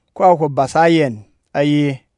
ko a hwo basa a yɛn, a ye: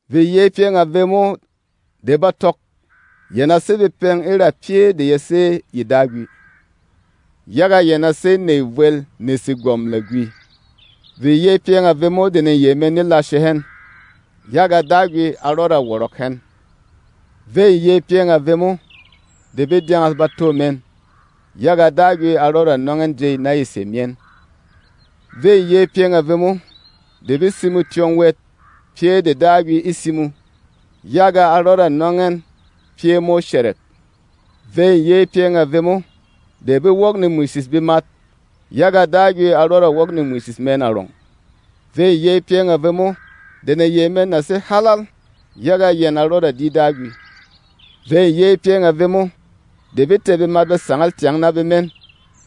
“Vê yey pyɛng a vemo de ba tɔk, yɛn a sé bepɛng e ra pyɛ́ de ya sé yê Dagwi, yaga yɛn a sé nèy vwel ne Segwɔm Lagwi! Vê yey pyɛng a vemo de neyey mɛn ne lashe hɛn, yaga Dagwi a rɔda wɔrɔk hɛn! Vê yey pyɛng a vemo de be dyɛngɛs bato mɛn, yaga Dagwi a rɔda nɔng ɛn jey na ye sè myɛn! Vê yey pyɛng a vemo de be simo tyɔng wɛt pyɛ́ de Dagwi e simo, yaga a rɔda nɔng ɛn pyɛ́ mo shɛrɛk! Vê yey pyɛng a vemo de be wok nemwishish bemat, yaga Dagwi a rɔda wok nemwishish mɛn arɔng! Vê yey pyɛng a vemo de neyey mɛn na sé haalal, yaga yɛn a rɔda di Dagwi! Vê yey pyɛng a vemo de be tɛ̀ bemat be sangal tyang na bemɛn,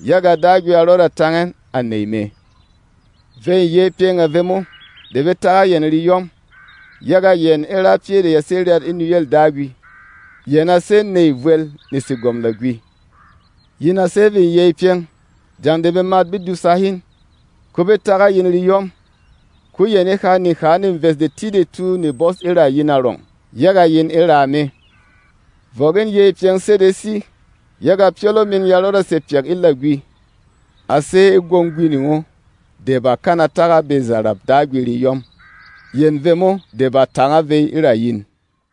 yaga Dagwi a rɔda tang ɛn, à nèy mɛ! Vê yey pyɛng a vemo de be tak a yɛn reyɔm, yaga yɛn e ra pyɛ́ de ya sé ryat e nuyêl Dagwi; yɛn a sé nèy vwel ne Segwɔm Lagwi! “Yin a sé vê yey pyɛng jeng de bemat be dùsa hin, ko be tak a yin reyɔm, ko yɛn e ha neha neves detidetu ne bɔs e ra yin arɔng, yaga yin e raa me. Vɔk in yey pyɛng sedesi, yaga pyɔlɔ min ya rɔda ba sè pyak e lagwi. A sé e gwong gwining o de bà kana tak a bezarap Dagwi reyɔm, yɛn vemo de bà tānga vey e ra yin.”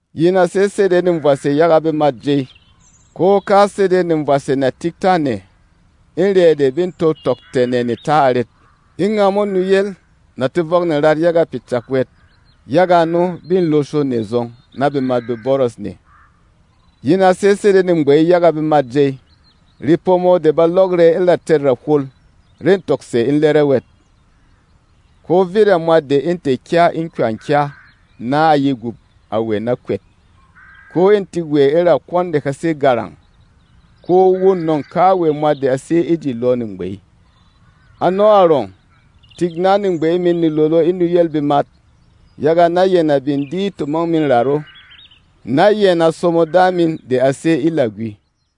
“Yin a sé sede nevwashe yaga bemât jey. Ko ka sede nevwashe na tik tâ nɛ, e rɛ̌ de bê to tɔk tɛ̀ nɛ ne ta arɛt? E ngamo nuyel na to vɔk nerat yaga pyɛ cak wɛt. Yaga ano, be losho nɛ zɔng, na bemat be bɔrɔs nɛ. “Yin a sé sede negbey yaga bemât jey. Repomo de ba lɔk rɛ e ra tɛ̂t rahwol re tɔk sè e lɛrɛ wɛt. Ko vit a mwat de ê tɛ̀ kya e kywa-kya na a ye gup a wɛ na kwɛt. Ko ê tik wɛ e ra kwɔn de ha sé garang, ko wô nɔ̂ng kawɛ mwat de a sé e ji lɔ negbey. Ano arɔng, tik na negbey min ne lolo e nuyêl bemat, yaga na yɛn a bin di tomong min rat o, na yɛn a somo Da min de a sé e lagwi.”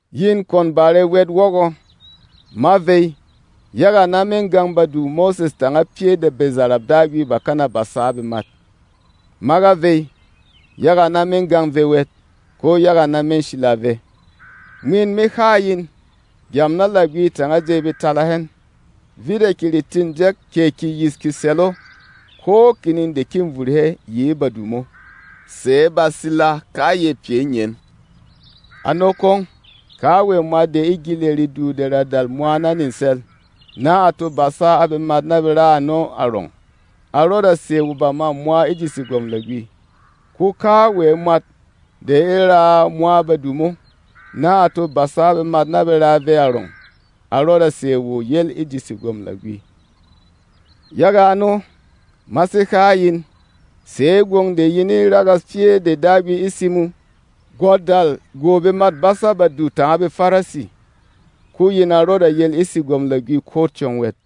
“Yin kwon bare wɛt wɔgɔ, ma vey, yaga na me gang Badu Mose tanga pyɛ́ de bezarap Dagwi bà kana basa a bemat. Ma ga vey, yaga na me gang vɛ wɛt, ko yaga na me sila vɛ. Mwin me ha a yin: Gyam na lagwi tanga jey be tala hɛn, vit a keretîn jɛk kɛ keyis kesɛl o ko kining de kê vuru hɛ yi e Badu mo, sɛ̌ ba sila kayɛ pyɛ e ngyen. Ano kwong, kawɛ mwat de e gyili redu de ra dal mwa na nesɛl, na a to basa a bemat be ra ano arɔng, a rɔda sè wo bamâ mwa e ji Segwɔm Lagwi. Ko kawɛ mwat de e raa mwa Badu mo, na a to basa a bemat be raa vɛ arɔng, a rɔda sè wo yel e ji Segwɔm Lagwi. Yaga ano, ma sé ha a yin, sɛ̌ gwong de yin e ragas pyɛ́ de Dagwi e simo gwa dal gwô bemât basâ Badu tanga BeFarisi, ko yin a rɔda yel e ji Segwɔm Lagwi ko tyɔng wɛt.”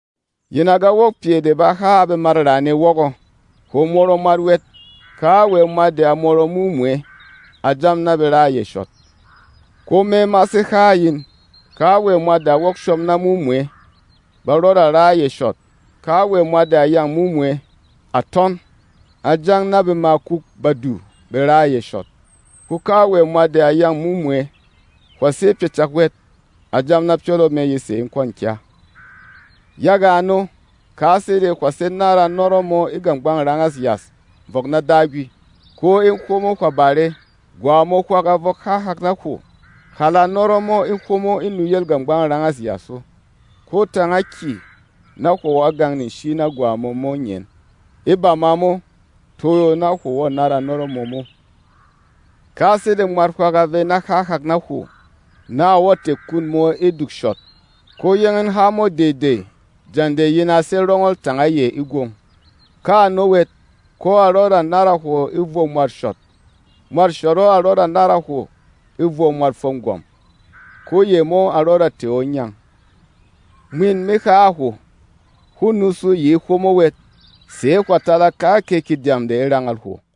“Yin a ga wok pyɛ de bà ha a bemât raane wɔgɔ, ‘Hwo mɔrɔ mwat wɛt! Kawɛ mwat de a mɔrɔ mumwɛ, a jam na be ra a yɛ shɔt.’ Ko me ma sé ha a yin, kawɛ mwat de a wok shom na mumwɛ, ba rɔda ra a yɛ shɔt. Kawɛ mwat de a yâng mumwɛ, à tɔn, a jam na bemakûk badu be ra a yɛ shɔt. Ko kawɛ mwat de a yâng mumwɛ, ‘Hwà sé pyɛ cak wɛt!’ a jam na pyɔlɔ mɛ ye sè e kwɔ̂n kya. Yaga ano, ka sede hwà sé nára nɔrɔ mō e gàgbang rangâs yas vɔk na Dagwi, ko e hwomo hwà bare, gwà mō hwak a vɔk há hak na hwo, hàla nɔrɔ mō e hwomo e nuyêl gàgbang rangas o, ko tānga kyè na hwo wɔ̀ gang-nshi na gwa mō e ngyen. E bama mo, toyo, na hwo wɔ̀ nára nɔrɔ mō mo. “Ka sede mwat hwak a vey na há hak na hwo, na a wɔ̀ tɛ̀ kun mō e duk shɔt, ko yóng in há mo dey-dey jeng de yin a sé rɔngɔl tanga yɛ e gwong. Ka ano wɛt, ko a rɔda nára hwo e vɔ mwât shɔt; mwât shɔt o a rɔda to nára hwo e vɔ mwât fwôm gwɔ̀m, ko yɛ mo a rɔda tɛ̀ o e ngyang. Mwin me ha a hwo: Hwô nusu yi e hwomo wɛt, sɛ̌ hwà tala kakɛ kedyam de e rangal hwo.”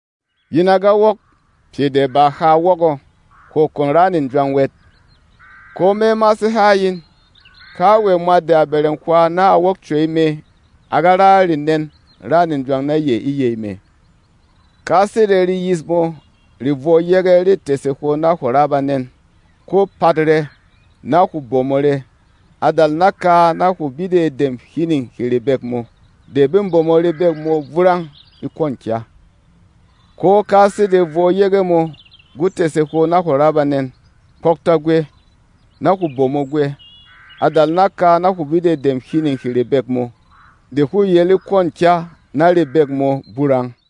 “Yin a ga wok pyɛ de bà ha wɔgɔ, ‘Hwo kwon ra nejwang wɛt!’ Ko me ma sé ha a yin, kawɛ mwat de a bɛrɛng hwā na a wok cwey mɛ a ga ra renɛ̂n râ nejwang na yɛ e yey mɛ. Ka sede reyis mō rê vwɔ yege re tɛ̀sɛ hwo na hwo ra banɛn, ko pat rɛ, na hwo bomo rɛ. A dal naka na hwo bidɛ dem hining hê rebek mō, de bê bomo rebek mō burang e kwɔ̂n kya. Ko ka sede vwɔ yege mō gwo tɛ̀sɛ hwo na hwo ra banɛn, kpɔktɔ gwɛ, na hwo bomo gwɛ. A dal naka na hwo bidɛ dem hining hê rebek mō, de hwô yel e kwɔ̂n kya na rebek mō burang.”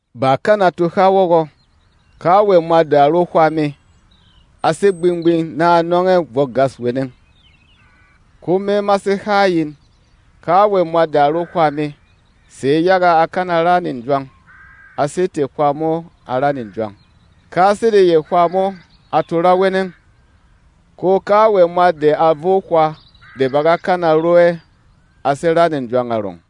“Bà kana to ha wɔgɔ, ‘Kawɛ mwat de a ro hwā mɛ, a sé gbing-gbing na a nɔng ɛ bwok gâs weneng.’ Ko me ma sé ha a yin, kawɛ mwat de a ro hwā mɛ, sɛ̌ yaga á kana ra nejwang, a sé tɛ̀ hwā mo a ra nejwang, ka sede yɛ hwā mo a to ra weneng. Ko kawɛ mwat de a vo hwā de ba ga kana ro ɛ a sé ra nejwang arɔng.”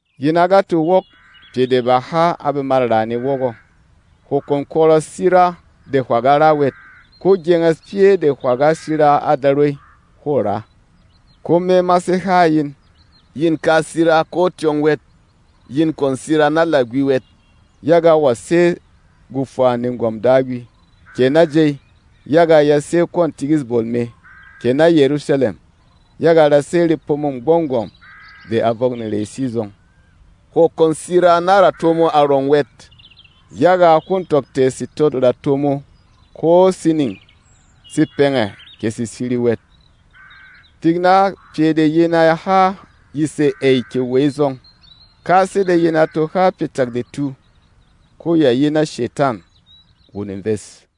“Yin a ga to wok pyɛ de bà ha a bemât raane wɔgɔ, ‘Hwo kwon kwɔrɔ sira de hwà ga ra wɛt, ko gyenges pyɛ́ de hwà ga sira a Darwey, hwô ra.’ Ko me ma sé ha a yin, yin ka sira ko tyɔng wɛt. Yin kwon sira na lagwi wɛt, yaga wa sé gwofwa negwɔm Dagwi, kɛ na jey, yaga ya sé kwɔ̂n tikîs bol mɛ, kɛ na Yɛrusalɛm, yaga ra sé repomô Gbɔng Gwɔ̀m de a vɔk nerey sizɔng. Hwo kwon sira na rato mō arɔng wɛt, yaga hwô tɔk tɛ̀ setôt rato mō ko sining se pɛngɛ kɛ se siri wɛt. Tik na pyɛ de yin a ha ye sè ‘ey’ kɛ ‘wey’ zɔng. Ka sede yin e to ha pyɛ cak detu, ko ya yi na Shetan, wo neves.”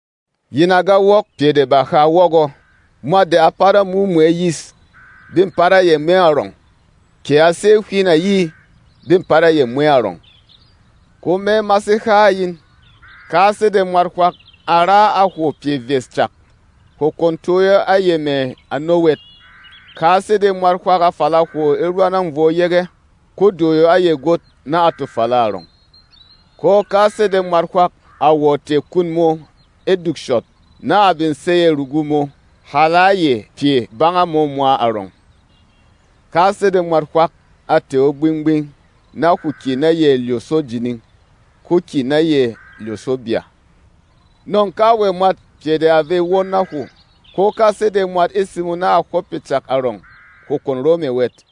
“Yin a ga wok pyɛ de bà ha wɔgɔ, ‘Mwat de a pat a mumwɛ yis, be pat a yɛ mɛ arɔng, kɛ a sé hwin ayi, be pat a yɛ mwɛ arɔng.’ Ko me ma sé ha a yin, ka sede mwat hwak a ra a hwo pyɛ vyes cak, hwo kwon toyo a yɛ mɛ̀ ano wɛt. Ka sede mwat hwak a fala hwo e rwanâng vwɔ yege, ko doyo a yɛ gwot na a to fala arɔng. Ko ka sede mwat hwak a wɔ̀ tɛ̀ kun mō e duk shɔt, na a bin sey ɛ̀ rugu mō, hàla a yɛ pyɛ banga mō mwa arɔng. Ka sede mwat hwak a tɛ̀ o gbing-gbing na hwo kyè na yɛ lyosho jining, ko kyè na yɛ lyōsho bya. Nɔ̂ng kawɛ mwat pyɛ de a vey won na hwo, ko ka sede mwat e simo na a hwɔp pyɛ cak arɔng, hwo kwon ro mɛ̀ wɛt.”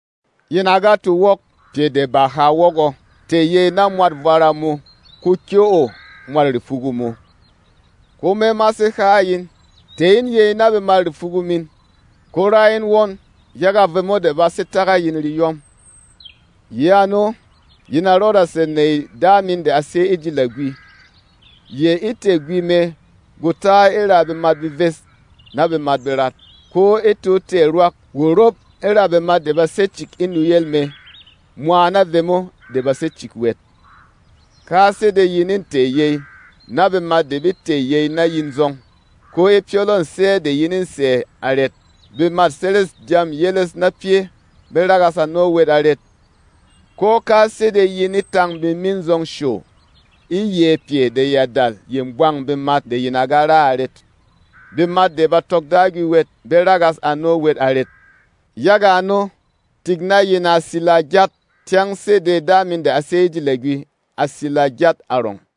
“Yin a ga to wok pyɛ de bà ha wɔgɔ, ‘Tɛ̀ yey na mwât vwara mō, ko kyɛ́ o mwât repugu mō.’ Ko me ma sé ha a yin, tɛ̀ in yey na bemât repugu min, ko rá in won yaga vemo de ba sé tak a yin reyɔm. Yi ano, yin a rɔda sè nèy Da min de a sé e ji lagwi. Yɛ e tɛ̀ gwi mɛ gwo ta e ra bemat beves na bemat berat, ko e to tɛ̀ rwak wo rop e ra bemat de ba sé cik e nuyel mɛ, mwa na vemo de ba sé cik wɛt. Ka sede yin e tɛ̀ yey na bemat de be tɛ̀ yey na yin zɔng, ko e pyɔlɔ̂ sɛ́ de yin ê sɛ̀ arɛt? Bemât seres dyâm yeles na pyɛ́ be ragas ano wɛt arɛt? Ko ka sede yin e tâng bemin zɔng show, e yɛ̌ pyɛ de ya dal ye bwang bemat de yin a ga ra arɛt? Bemat de ba tɔk Dagwi wɛt be ragas ano wɛt arɛt? Yaga ano, tik na yin a sila gyat, tyɛng sede Da min de a sé e ji lagwi a sila gyat arɔng.”